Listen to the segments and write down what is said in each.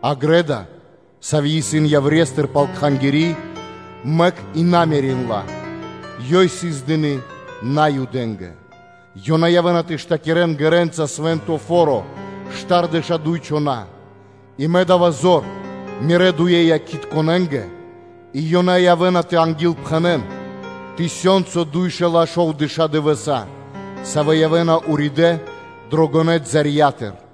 А грэ́да (дво́ро), сави́ исын яврестыр пал Кхангири́, мэк ла и на мерин ла. Ёй сыс дыны́ Наюдэ́нгэ. Ёнэ явэ́на тэ штакирэн ґэрэ́нца Свэ́нто Фо́ро штардэша́ дуй чхона́. И мэ да́ва зор мирэ́ дуе Якхитконэнгэ и ёнэ явэ́на тэ ангилпхэнэн тысёнцо дуй шэла́ шовдэша́ дывэса́, савэ́ явэ́на уридэ́ дрэ гонэ́ балэндыр.”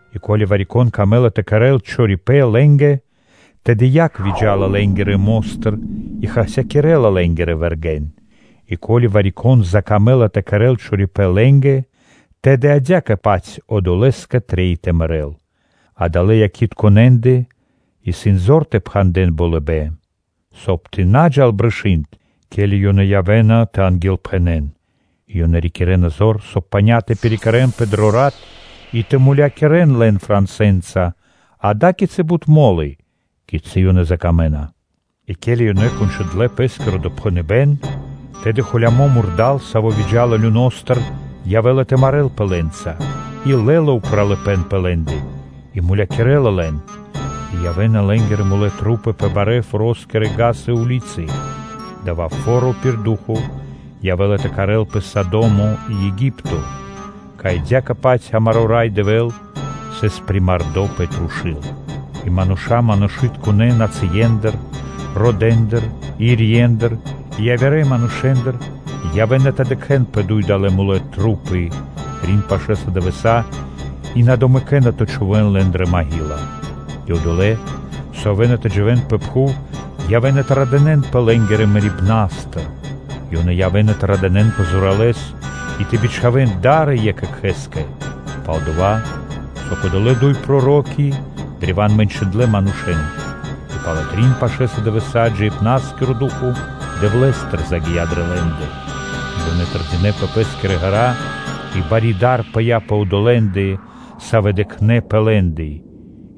И ко́ли вари-кон выкэдэ́ла тэ кэрэ́л чорипэ́н лэ́нгэ, тэды яг выджа́ла лэ́нгирэ мо́стыр и хасякирэ́ла лэ́нгирэ вэргэ́н. И ко́ли вари-кон закамэ́ла тэ кэрэ́л чорипэ́н лэ́нгэ, тэды адя́кэ-паць одолэ́скэ трэй тэ мэрэ́л. Адалэ́ Якхитконэндэ исын зор тэ пхандэн болыбэ́н, соб (кай) тэ на джал брышы́нд, ке́ли ёнэ явэ́на тэ ангилпхэнэн (тэ пророчынэн). И ёнэ рикирэ́на зор, соб (кай) паня́ тэ пирикэрэнпэ дро рат и тэ мулякирэ́н лэн франсэнца ада́кицы бут мо́лы, кицы́ ёнэ выкэдэна. И ке́ли ёнэ кончындлэ пэ́скиро допхэныбэ́н, тэды драконо, саво́ выджа́ла люностыр, явэ́ла тэ марэ́лпэ лэ́нца, и лэ́ла упралыпэ́н пэ лэ́ндэ и мулякирэ́ла лэн. И явэ́на лэ́нгирэ тру́пы пэ барэ́-форо́скирэ вули́цы (га́сы). Дава́ фо́ро пир ду́хо (фа́но) явэ́ла тэ кхарэлпэ Содо́мо и Еги́пто, кай адя́кэ-паць амаро́ Рай Дэвэ́л сыс примардо пэ трушу́л. И мануша́ манушытконэ́ нацые́ндыр, екхэ-чибакирэ ирье́ндыр (сэм΄е́ндыр), кхэритконэ́ родэндыр и явирэ манушэ́ндыр явэ́на тэ дыкхэ́н пэ дуй далэ́ тру́пы трин пашэ́са дывэса́ и на домэкэна тэ заганавэн лэн дрэ пхув. И одолэ́, савэ́ явэ́на тэ дживэ́н пэ пхув, явэ́на тэ радынэ́нпэ лэ́нгирэ мэрибна́стыр. Ёнэ явэ́на тэ радынэппэ зоралэ́с и тэ бичхавэн да́ры екх екхэ́скэ, пал-дова́ со кодолэ́ дуй проро́ки древа́н мэнчындлэ манушэ́н. И пало́ трин пашэ́са дывэса́ джиибна́скиро ду́хо (фа́но) Дэвлэ́стыр загия́ дрэ лэ́ндэ. Ёнэ тэрдинэ́ пэ пэ́скирэ ґэра́ и бари дар пыя́ пэ одолэ́ндэ, савэ́ дыкхнэ́ пэ лэ́ндэ.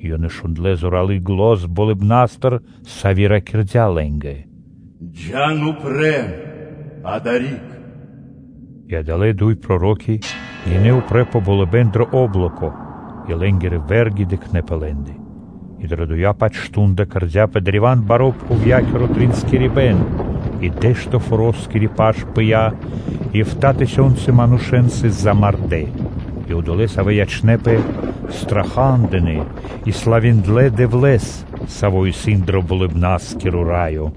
И ёнэ шундлэ́ зоралы́ зан болыбна́стыр, со ракирдя́ лэ́нгэ: “Джа́н упрэ́ адари́к.” И адалэ́ дуй проро́ки гинэ́ упрэ́ пэ болыбэ́н дро о́блоко, и лэ́нгирэ вэ́рги дыкхнэ́ пэ лэ́ндэ. И дро дова-паць мардо́ (шту́нда) кэрдя́пэ древа́н баро́ пхувья́киро тринскирибэн и дэ́што форо́скири паш пыя́, и эфта́ тысёнцы манушэ́н сыс замардэ́. И одолэ́, савэ́ ячнэ́пэ, страха́дынэ и славиндлэ Дэвлэ́с, Саво́ исын дро Болыбна́скиро Раё.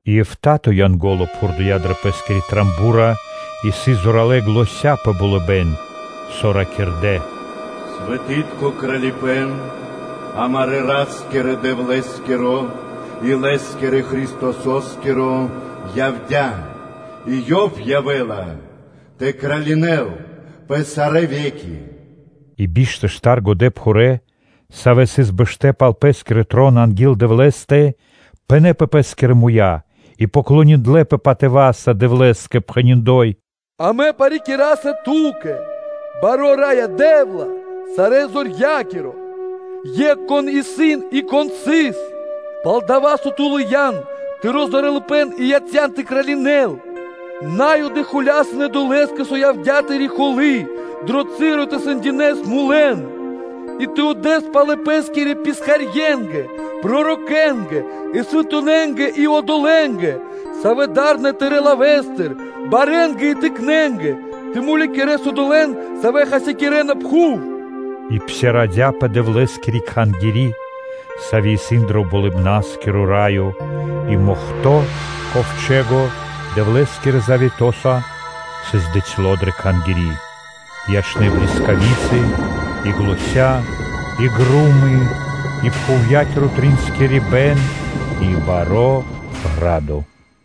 И эфта́то (битринэнтиро дэ́што) Янго́ло пхурдыя дрэ пэ́скиро ро́го (труба): и сыс зоралэ́ заня́ пэ болыбэ́н, со ракирдэ́: “Свэтытко Кралипэ́н амарэ́ Ра́скирэ-Дэвлэ́скиро и Лэ́скирэ Христосо́скиро явдя́ и Ёв явэ́ла тэ кралинэн пэ сарэ́ ве́ки.” И биш тэ штар годэпхурэ́, савэ́ сыс бэштэ́ пал пэ́скирэ троны анги́л Дэвлэ́стэ пынэ́ пэ пэ́скирэ муя́ и поклониндлэпэ патыва́са Дэвлэ́скэ, пхэни́: “Амэ парикираса Ту́кэ, Баро́ Раё Дэ́вла, Сарэзорья́киро, Екх, Кон исын и Кон сыс, пал-дова́ со Ту лыян Тыро́ зоралыпэ́н и яця́н тэ кралинэс. На́юды холясынэ долэ́скэ, со явдя́ Тыри́ холы́ дро часо тэ сэндякирэс мулэн, и тэ отдэс палэ Пэ́скирэ писхарье́нгэ, пророкэнгэ, и свэнтонэнгэ и одолэ́нгэ, савэ́ дарэ́на Тырэ́ лавэ́стыр, барэнгэ и тыкнэнгэ. Тэ мулякирэс одолэ́н, савэ́ хасякирэна пхув.” И псирадыя (отпхандя́пэ) Дэвлэ́скири Кхангири́, сави́ исын дро Болыбна́скиро Раё и Ковчэ́го (Мохто́) Дэвлэ́скирэ завето́са сыс дыцьло дрэ Кхангири́. И ячнэ́ блискави́цы, и заня́ (глося́), и гро́мы, и пхувья́киро триинскирибэн и баро́ ґра́до.